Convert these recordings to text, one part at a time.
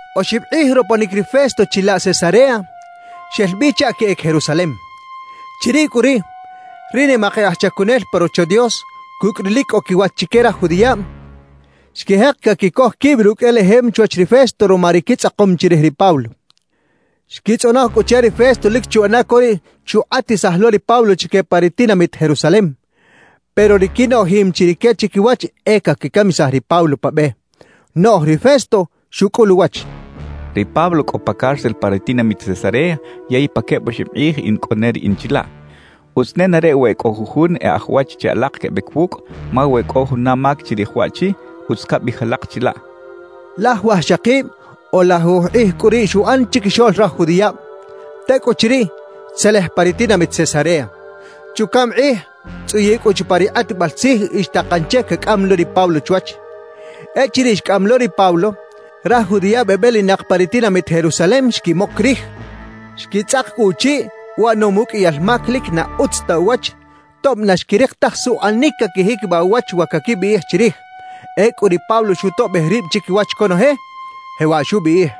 Oxib kꞌij roponic ri Festo chilaꞌ Cesarea, xel bi chaꞌ queꞌec Jerusalem. Chiriꞌ cꞌu riꞌ, ri nimak e aj chacunel pa Rocho Dios cucꞌ ri lic cꞌo quiwach chique raj judiꞌab, xquijek caquicoj quib rucꞌ elejem chwach ri Festo ruma ri quitzꞌakom chirij ri Pablo. Xquitzꞌonoj cꞌu che ri Festo lic chuꞌana co riꞌ chukꞌatisaj lo ri Pablo chique pa ri tinamit Jerusalem, pero ri quinoꞌjim chi rique chiquiwach e caquicamisaj ri Pablo pa be. Noꞌj ri Festo xucꞌul uwach: «Ri Pablo cꞌo pa cárcel pa ri tinamit Cesarea, yey pa queb oxib kꞌij in cꞌo ne riꞌin chilaꞌ. Utz nenareꞌ we e cꞌo jujun e aj wach che alak quebec wucꞌ, ma we cꞌo juna mac chirij waꞌchi, utz cabiꞌij alak chilaꞌ» xchaꞌ. Laj wajxakib o lajuj kꞌij cꞌu riꞌ xuꞌan chiquixoꞌl raj judiꞌab; tecꞌuchiriꞌ, xtzelej pa ri tinamit Cesarea. Chucaꞌm kꞌij, xtzꞌuyiꞌ cꞌu chupa ri kꞌatbal tzij y xtakan che cacꞌam lo ri Pablo chwach. Echiriꞌ xcꞌam lo ri Pablo, raj judiꞌab ebelinak pa ri tinamit Jerusalem xquimoc rij, xquitzꞌak cꞌu uchiꞌ uꞌanom uqꞌuiyal mac lic na utz ta uwach, tob na xquirik taj suꞌanic caquijiquibaꞌ uwach wa caquibiꞌij chirij. Ecꞌu ri Pablo xutoꞌbej rib chiquiwach conoje, jewaꞌ xubiꞌij: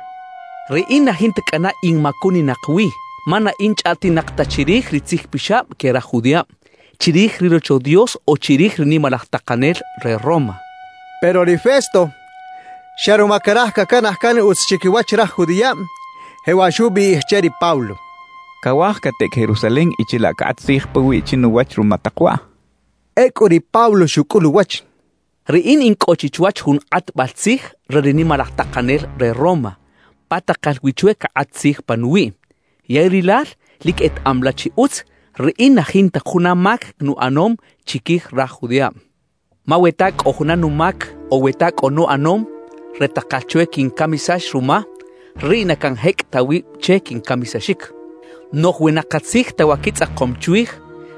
—Riꞌin na jinta cꞌana in macuninak wi, ma na in chꞌaꞌtinak ta chirij ri tzijpixab que raj judiꞌab, chirij ri Rocho Dios o chirij ri nimalaj takanel re Roma —xchaꞌ. Pero ri Festo, xa ruma caraj cacanaj can utz chiquiwach raj judiꞌab, jewaꞌ xubiꞌij che ri Pablo: —¿Cawaj cateꞌec Jerusalem y chilaꞌ cakꞌat tzij pawiꞌ chinuwach ruma tak waꞌ? —xchaꞌ. Ecꞌu ri Pablo xucꞌul uwach: —Riꞌin in cꞌo chi chwach jun kꞌatbal tzij re ri nimalaj takanel re Roma, pa takal wi chwe cakꞌat tzij panuwiꞌ. Yey rilal lic etaꞌam la chi utz, riꞌin na jinta juna mac nuꞌanom chiquij raj judiꞌab. Ma we ta cꞌo juna numac o we ta cꞌo nuꞌanom re takal chwe quincamisax ruma, riꞌ na canjecꞌ ta wib che quincamisaxic. Noꞌj we na katzij ta wa quitzꞌakom chwij,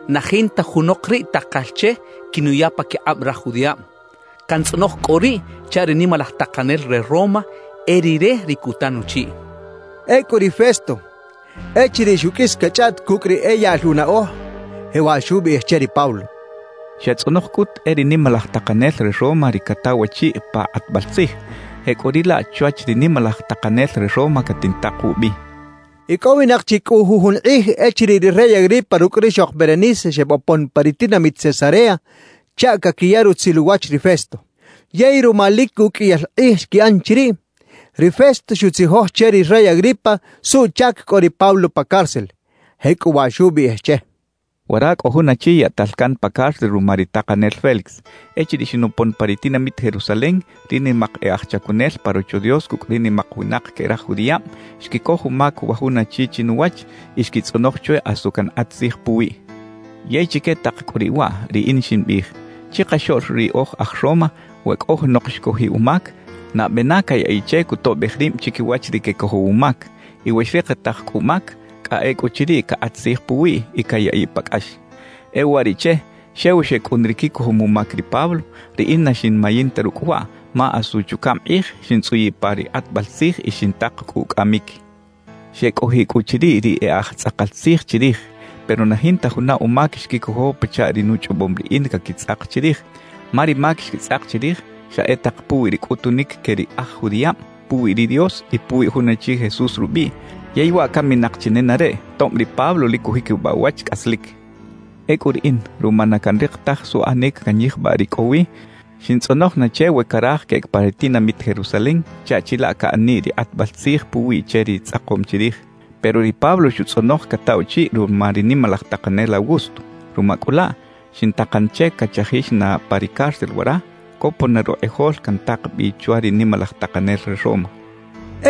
na jinta junok riꞌ takal che quinuya paquikꞌab raj judiꞌab. Cantzꞌonoj cꞌu riꞌ chaꞌ ri nimalaj takanel re Roma, e rire ri cuta nuchiꞌ —xchaꞌ. Ecꞌu ri Festo, echiriꞌ xuqꞌuis cachꞌaꞌt cucꞌ ri e yaꞌl unaꞌoj, jewaꞌ xubiꞌij che ri Pablo: —Xatzꞌonoj cꞌut e ri nimalaj takanel re Roma ri cataw achiꞌ pa kꞌatbal tzij; jecꞌuriꞌlaꞌ chwach ri nimalaj takanel re Roma catintak wubi —xchaꞌ. Icꞌowinak chi cꞌu jujun kꞌij echiriꞌ ri rey Agripa rucꞌ rixok Berenice xebopon pa ri tinamit Cesarea chaꞌ caquiya rutzil uwach ri Festo. Yey ruma lic uqꞌuiyal kꞌij xquiꞌan chiriꞌ, ri Festo xutzijoj che ri rey Agripa suꞌchac cꞌo ri Pablo pa cárcel, jecꞌuwaꞌ xubiꞌij che: —Wara cꞌo jun achi yaꞌtal can pa cárcel ruma ri takanel Félix. Echiriꞌ xinopon pa ri tinamit Jerusalem, ri nimak e aj chacunel pa Rocho Dios cucꞌ ri nimak winak que raj judiꞌab, xquicoj umac wa jun achi chinuwach y xquitzꞌonoj chwe asu cankꞌat tzij puwiꞌ. Yey chique tak cꞌu riꞌ waꞌ, riꞌin ximbiꞌij: Chikaxoꞌl ri oj aj Roma, we cꞌo junok xcojiꞌ umac, nabe na cayaꞌiꞌ che cutoꞌbej rib chiquiwach ri quecojow umac. Y we xrikitaj cꞌu umac, cꞌa ecꞌuchiriꞌ, cakꞌat tzij puwiꞌ y cayaꞌiꞌ pa cꞌax. »E uwariꞌche, xew xecꞌun ri quicojom umac ri Pablo, riꞌin na xinmayin ta rucꞌ waꞌ; ma asu chucaꞌm kꞌij, xintzꞌuyiꞌ pa ri kꞌatbal tzij y xintak cꞌu ucꞌamic. »Xecꞌojiꞌ cꞌu chiriꞌ ri e aj tzꞌakal tzij chirij, pero na jinta juna umac xquicojo pachaꞌ ri nuchꞌobom riꞌin caquitzꞌak chirij. Ma ri mac xquitzꞌak chirij, xa e tak puwi ri cꞌutunic que ri aj judiꞌab puwi ri Dios y puwi jun achi Jesús rubiꞌ, yey waꞌ caminak chi nenareꞌ, tob ri Pablo lic cujiquibaꞌ uwach cꞌaslic. »Ecꞌu riꞌin, ruma na canrik taj suꞌanic canyijbaꞌ ri cꞌo wi, xintzꞌonoj na che we caraj queꞌec pa ri tinamit Jerusalem chaꞌ chilaꞌ caꞌaniꞌ ri kꞌatbal tzij puwiꞌ che ri tzꞌakom chirij. Pero ri Pablo xutzꞌonoj cataꞌ uchiꞌ ruma ri nimalaj takanel Augusto. Ruma cꞌu laꞌ, xintakan che cachajix na pa ri cárcel wara, copon na rukꞌijol cantak bi chwa ri nimalaj takanel re Roma —xchaꞌ.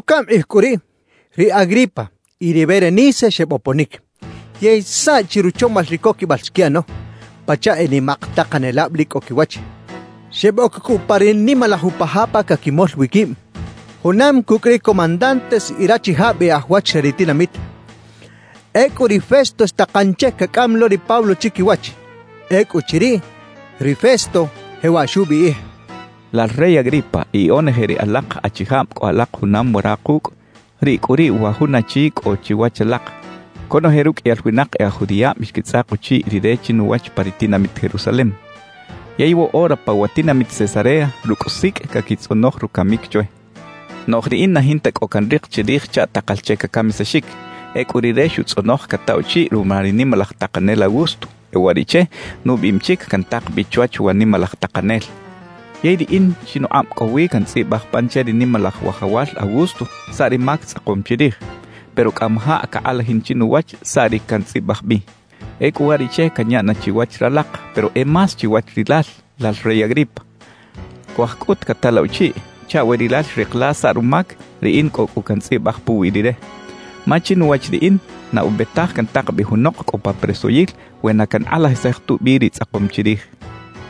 Chucaꞌm kꞌij cꞌu riꞌ, ri Agripa y ri Berenice xeboponic. Yey saꞌchi ruchomal ri coquibal xquiꞌano, pachaꞌ e nimak takanelab lic cꞌo quiwach. Xeboc cꞌu pa ri nimalaj upa ja pa caquimol wi quib, junam cucꞌ ri comandantes y rachijab e aj wach re ri tinamit. Ecꞌu ri Festo xtakan che cacꞌam lo ri Pablo chiquiwach. Ecꞌuchiriꞌ, ri Festo jewaꞌ xubiꞌij: «Lal rey Agripa y onoje ri alak achijab cꞌo alak junam wara kucꞌ, riꞌ cꞌu riꞌ wa jun achi cꞌo chiwach alak. Conoje ruqꞌuiyal winak e aj judiꞌab xquitzꞌak uchiꞌ rire chinuwach pa ri tinamit Jerusalem. Yey woꞌora pa wa tinamit Cesarea, rucꞌ sicꞌ caquitzꞌonoj rucamic chwe. Noꞌj riꞌin na jinta cꞌo canrik chirij chaꞌ takal che cacamisaxic. Ecꞌu rire xutzꞌonoj cataꞌ uchiꞌ ruma ri nimalaj takanel Augusto; e uwariꞌche, nubiꞌim chic cantak bi chwach wa nimalaj takanel. »Yey riꞌin chinukꞌab cꞌo wi cantzꞌibaj pan che ri nimalaj wajawal Augusto saꞌ ri mac tzꞌakom chirij. Pero cꞌamajaꞌ cakꞌalajin chinuwach saꞌ ri cantzꞌibaj bi. »Ecꞌu uwariꞌche canya na chiwach ralak, pero e más chiwach rilal, lal rey Agripa. Cuaj cꞌut cata la uchiꞌ chaꞌ we rilal xrik la saꞌ rumac, riꞌin cꞌo cꞌu cantzꞌibaj puwi rire. Ma chinuwach riꞌin, na ube taj cantak bi junok cꞌo pa presoyil we na cankꞌalajisaj tubi ri tzꞌakom chirij» xchaꞌ.